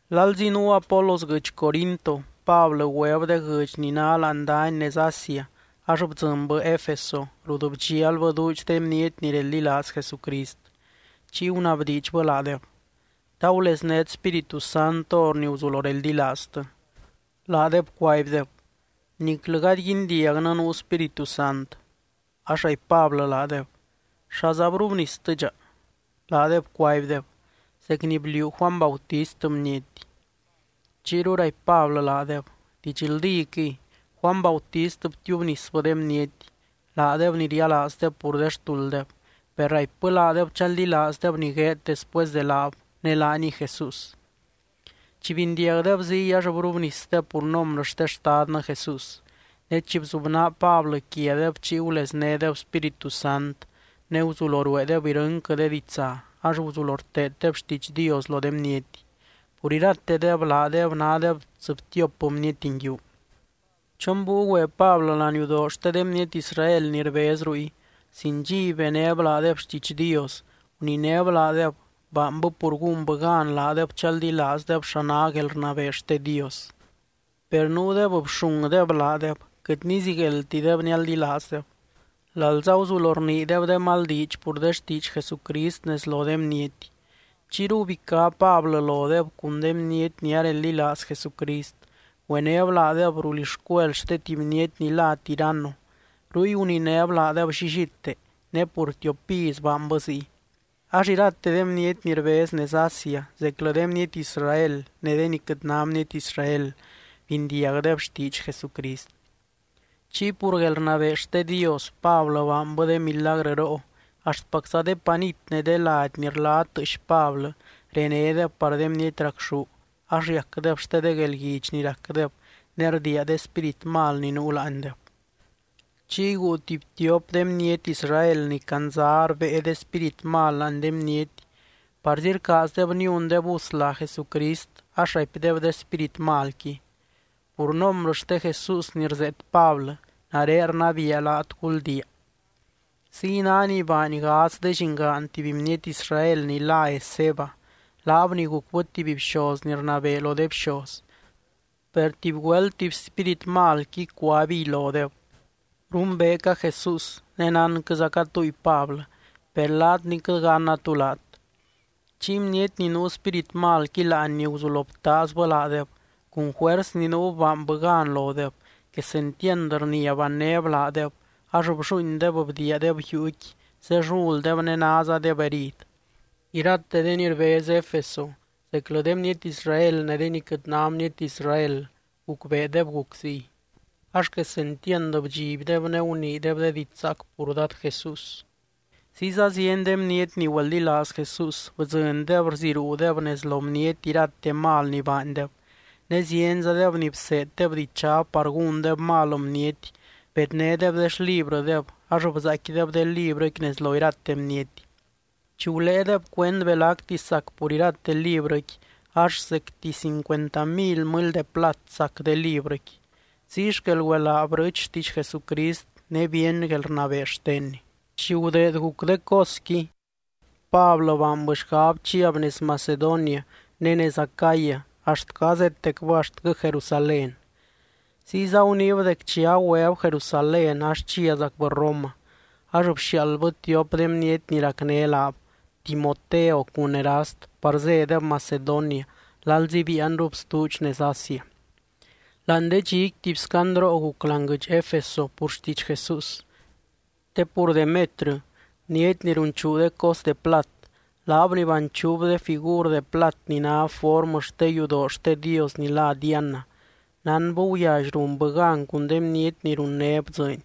Lalzi nuu Apolos guɨdx Corinto, Pablɨ güeb de guɨdx ni ná láani dany nez Asia ax bdzɨnbɨ Efeso rut bdxialbɨ duudx de bniety ni reldilaaz Jesucrist. Chiy gunabdiidxbɨ laadeb: —¿Ta guleznét Spíritu Sant hor ni guzulo reldilaaztɨ? Laadeb cuaibdeb: —Niclɨ gady guindiagnɨ nuu Spíritu Sant. Ax raipy Pablɨ laadeb: —¿Xaza brubnistɨdxa? Laadeb cuaibdeb: —Zec ni bliuu Juany Bautist bniety. Chiyru raipy Pablɨ laadeb: —Didxldíquɨy, Juany Bautist btiubnisbɨ de bniety, laadeb ni rialaazdeb pur de xtulddeb, per raipbɨ laadeb chaldilaazdeb ni gueed después de laab, ne laaniy Jesús. Chi bindiagdeb ziy, ax brubnisdeb pur nombrɨ xte Xtadnɨ Jesús. Ne chi bzubnaa Pablɨ quiadeb chiy guleznédeb Spíritu Sant, ne guzulo rueedeb irɨnquɨ de ditsa ax guzulo rteeddeb xtiidx Dios lo de bniety. Pur iratedeb, laadeb nádeb tsɨbtiop bniety nguiu. Chon búiu güe Pablɨ laniudoo xte de bniety Israel ni rbez ruy, sin dxiby benéb laadeb xtiidx Dios. Guninéb laadeb, baanbɨ pur gúnbɨ gan laadeb chaldilaazdeb xa ná guelrnabee xte Dios. Per nuudeb bxungdeb laadeb, quɨt nizigueldtideb nialdilaazdeb, lalza guzulo rniideb de mal diidx pur de xtiidx Jesucrist nez lo de bniety. Chiyru gubicá Pablɨ lodeb cun de bniety ni areldilaaz Jesucrist, güenéb laadeb rulixcuel xte tuby bniety ni lá Tiranno. Ruy guninéb laadeb llillite, ne pur tiop iz baanbɨ ziy. Ax irate de bniety ni rbez nez Asia, zeclɨ de bniety Israel ne de ni quɨt ná bniety Israel, bindiagdeb xtiidx Jesucrist. Chiy pur guelrnabee xte Dios, Pablɨ baanbɨ de milagrɨroo, axtpacza de panit ne de lady ni rla tɨɨx Pablɨ renédeb par de bniety racxú, ax riacdeb xte de guelguidx ni racdeb ne rdiia de spírit mal ni nuu láandeb. Chiy guu tuby tiop de bniety Israel ni candza rbée de spírit mal láani de bniety, parzi rcaazdeb niundeb us lá Jesucrist ax raipdeb de spírit malqui: —Pur nombrɨ xte Jesús ni rzeet Pablɨ, nare rnabiia laat, guldiia. Ziy ná ni baany gadz de llingaan tuby bniety Israel ni lá Esceva, laab ni gucbɨ tuby bxoz ni rnabee lo de bxoz. Per tuby güelt tuby spírit malqui, cuaibiy lodeb: —Rumbeeca Jesús, ne nánquɨzaca túy Pablɨ, per laat ni quɨt ganna tú laat. Chiy bniety ni nuu spírit malqui láanni guzulo btaazbɨ laadeb, cun juers ni nuub baanbɨ gan lodeb. Quesentiand rnia bannéb laadeb, ax blluuindeb bdiiadeb yuuqui zelluldeb ne názadeb herid. Irate de ni rbez Efeso, zeclɨ de bniety Israel ne de ni quɨt ná bniety Israel, gucbeedeb guc ziy. Ax quesentiand bdxibdeb ne guniideb de diidx zaac pur Dad Jesús. Ziyza zieny de bniety ni güeldilaaz Jesús, bdzɨndeb rziruudeb nez lo bniety irate mal ni baandeb. Ne zienzadeb ni bseeddeb dichab par gúndeb mal bniety bednédeb de xlibrɨdeb, ax bzaaicquideb de librɨqui nez lo irate bniety. Chi guléedeb cuend belacti sac pur irate librɨqui, ax zecti cincuenta mily mɨly de plat sac de librɨqui. Ziy xquel güelaa brɨɨch xtiidx Jesucrist ne bíeny guelrnabee xtenny. Chi gudeed guc de cosqui, Pablɨ baanbɨ xgab chiab nez Macedonia ne nez Acaya axtquɨ azétecbɨ axtquɨ Jerusalén. Ziyza guniib dec chi agüeb Jerusalén ax chiazacbɨ Roma. Ax bxiaaldbɨ tiop de bniety ni racné laab, Timoteo cun Erast par zédeb Macedonia lalzi biianrub stuudx nez Asia. Láani de dxiqui tuby scandroo guc láani guɨdx Efeso pur xtiidx Jesús. Te pur Demetrɨ, bniety ni runchuu de cos de plat, laab ni banchuub de figur de plat ni ná formɨ xte yudoo xte dios ni lá Diana, nánbɨ guyally runbɨ gan cun de bniety ni runnéb dzɨɨny.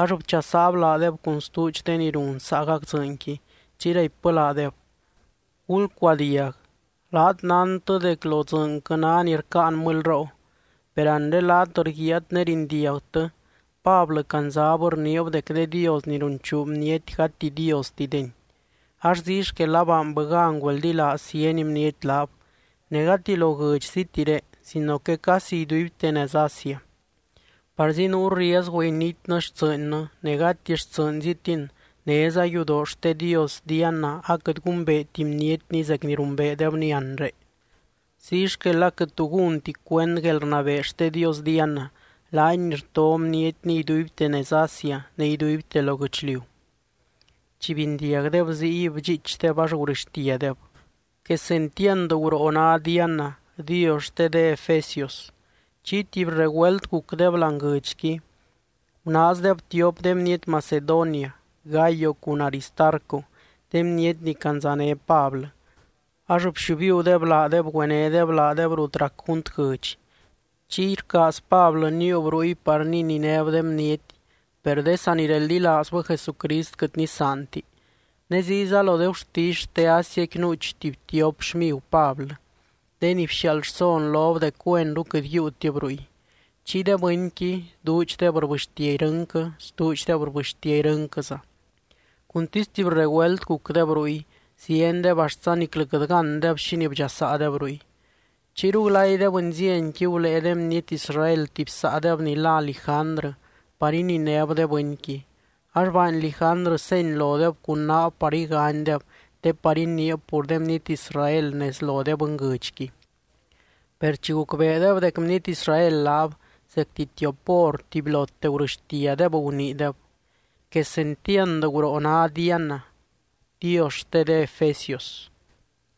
Ax bchasaab laadeb cun stuudx de ni run saagac dzɨɨnqui, chiy raipbɨ laadeb: —Gulcuadiag, laat nántɨ dec lo dzɨɨnquɨ ná ni rcáan mɨlyroo. Per anre laat rguiaat ne rindiagtɨ, Pablɨ candzab rniib dec de dios ni runchuu bniety gati diostideni. Ax ziy xquel abaanbɨ gan güeldilaaz zieny bniety laab, ne gati lo guɨdxzitiré, sino que casi iduibte nez Asia. Parzi nuu riezgu initnɨ xtsɨɨnnɨ, ne gati xtsɨɨnzitin, néza yudoo xte dios Diana aquɨt gumbeeti bnietni zec ni rumbeedebni anre. Ziy xquel aquɨt tu gúnti cuend guelrnabee xte dios Diana, laany ni rto bnietni iduibte nez Asia ne iduibte lo guɨchliu. Chi bindiagdeb ziy, bdxiichdeb, ax gurɨxtiadeb: —¡Quesentiand guroo ná Diana, dios xte de efesios! Chiy tuby regüelt gucdeb láani guɨdxqui. Gunaazdeb tiop de bniety Macedonia, Gayo cun Aristarco, de bniety ni candzané Pablɨ, ax bxiubiudeb laadeb güenédeb laadeb rut rac junt guɨdx. Chiy rcaaz Pablɨ níiub ruy par nininéb de bniety, per de sanireldilaazbɨ Jesucrist quɨt nisaanti. Ne ziyza lo de gurtisy xte Asiaqui nuuch tuby tiop xmigu Pablɨ, de ni bxiaald rson lob dec güenru quɨt yiiutib ruy. Chiy de bɨnqui, duudxdeb rbɨxtia irɨnquɨ, stuudxdeb rbɨxtia irɨnquɨza. Cuntisy tuby regüelt gucdeb ruy, ziendeb axtza niclɨ quɨt gándeb xínii bdxasaadeb ruy. Chiyru glay de bɨnzienqui gulée de bniety Israel tuby saadeb ni lá Lijandrɨ par ininéb de bɨnqui. Ax baany Lijandrɨ seny lodeb cun naab par iganydeb te par iniib pur de bniety Israel nez lo de bɨnguɨdxqui. Per chi gucbeedeb dec bniety Israel laab, zecti tiop hor tubylote gurɨxtiadeb, guniideb: —¡Quesentiand guroo ná Diana, dios xte de efesios!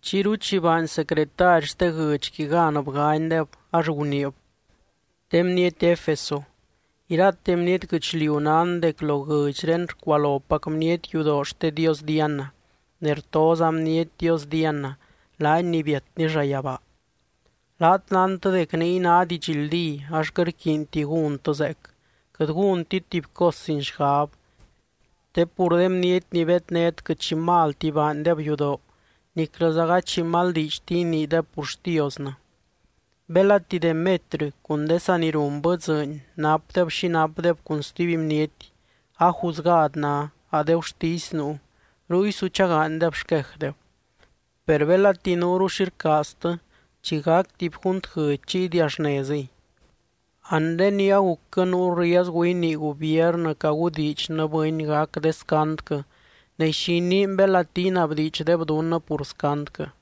Chiyru chi baany secretary xte guɨdxqui gan bganydeb, ax guniib: —De bniety Efeso, irate bniety guɨchliu nán dec lo guɨdxré rcualopac bniety yudoo xte dios Diana, ne rtoza bniety dios Diana, laany ni biatny llayabaa. Laat nántɨ dec niy ná didxldí ax quɨt rquiinti gúntɨ zeec, quɨt gúntit tuby cos sin xgab. Te pur de bniety ni bednét quɨt xi malti baandeb yudoo, niclɨza gady xi mal diidxti iniideb pur xtiosnɨ. Belati Demetrɨ cun de saa ni runbɨ dzɨɨny napdeb xi napdeb cun stuby bniety, a juzgad ná, a de gurtisy nuu, ruy su chagaanydeb xquejdeb. Per belati nuuru xi rcaaztɨ, chi gac tuby junt guɨdx chiy idiaxnezɨy. Anre ni agucquɨ nuu riezgu inii gubiernɨ cagudiidxnɨ bɨny gac de scandquɨ ne, ¿xi iniin belati inabdiidxdeb dunnɨ pur scandquɨ?